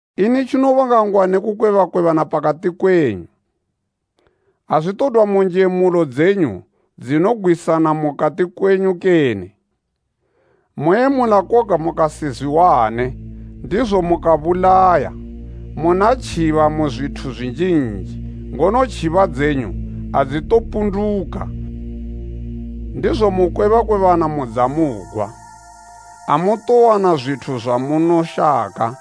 Ini tjinobanga ngwa ne kukwebakwebana pakati kwenyu? Azwitodwa mu njemulo dzenyu dzinogwisana mukati kwenyu kene? Moyemula koga mukasizwiwane, ndizo mukabulaya. Muna tjiba mu zwithu zwinjinji, ngono tjiba dzenyu adzitopunduka, ndizo mukwebakwebana mudza mugwa. Amutowana zwithu zwamunoshaka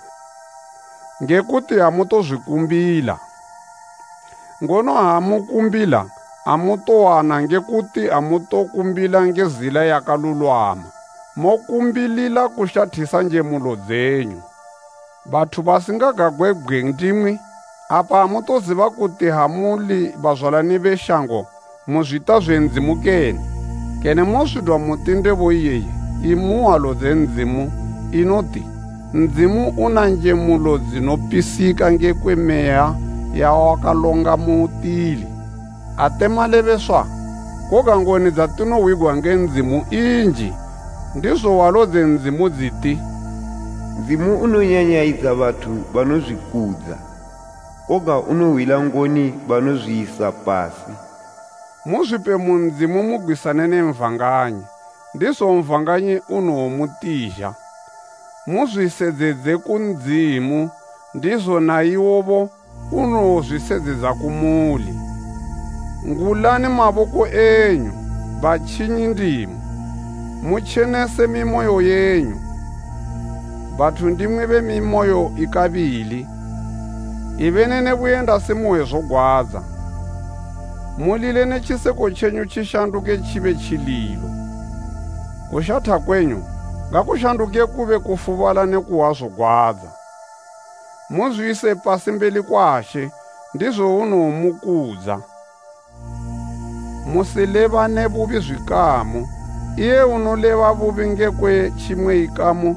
nge kuti amutozwikumbila. Ngono ha mukumbila amutowana nge kuti amutokumbila nge zila yakalulwama. Mokumbilila kushathisa njemulo dzenyu. Bathu basingagagwebgwe ndimwi! Apa amutoziba kuti ha muli bazwalani be shango mu zwita zwe Ndzimu kene? Kene mozwidwa muti ndebo iyeyi imu hwalo dze Ndzimu, inoti “Ndzimu una njemulo dzinopisika ngekwe meya yawakalonga mutili,” ate malebeswa? Koga ngoni dzatinohwigwa nge Ndzimu inji, ndizo hwalo dze Ndzimu dziti, “Ndzimu unonyanyayidza bathu banozwikudza, koga unohwila ngoni banozwiyisa pasi.” Muzwipe mu Ndzimu mugwisane na Satani, ndizo Satani unowomutizha. Muzwisedzedze ku Ndzimu ndizo na iwobo unowozwisedzedza kumuli. Ngulani maboko enyu, batjinyi ndimwi! Mutjenese mimoyo yenyu, bathu ndimwi be mimiyo ikabili! Ibeni ne buyendasi muhwe zogwadza mulile ne tjiseko tjenyu tjishanduke tjibe tjililo. Kushatha kwenyu ngakushanduke kube kufubala ne kuhwa zogwadza. Muzwiyise pasi mbeli kwa She ndizo unowomukudza. Musilebane bubi zwikamu. Iye unoleba bubi ngekwe tjimwe ikamu,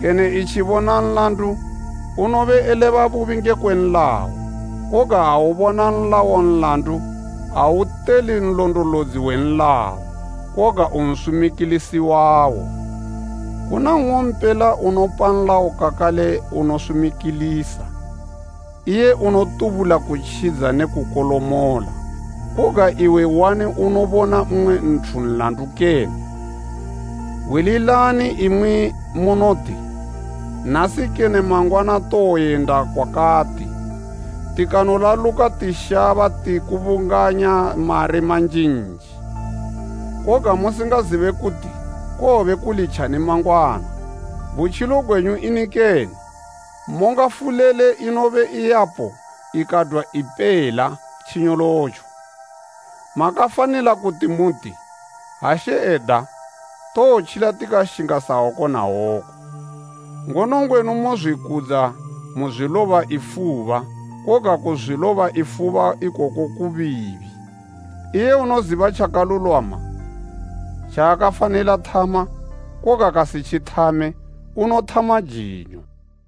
kene etjibona nlandu, unobe eleba bubi ngekwe nlayo, koga ha ubona nlayo nlandu auteuli nlondolodzi we nlayo koga unsumikilisi wawo. Kuna nng'ompela unopa nlayo kakale unosumikilisa, iye unotubula kutjidza ne kukolomola. Koga iwe, uani unobona mmwe nthu nlandu kene? Hwililani imwi munoti, “Nasi kene mangwana towoyenda kwakati, tikanolaluka tishaba tikubunganya mari manjinji,” koga musingazibe kuti kowobe kuli tjani mangwana. Butjilo gwenyu ini kene? Monga fulele inobe yapo ikadwa ipela tjinyolotjo. Makafanila kuti muti, “Ha She eda, towotjila tikashinga sa woku na woku.” Ngono ngwenu mozwikudza muzwiloba ifuba. Koga kuzwiloba ifuba ikoko kubiibi. Iye unoziba tjakalulwama tjaakafanila thama koga kasitjithame, unothama jinyo.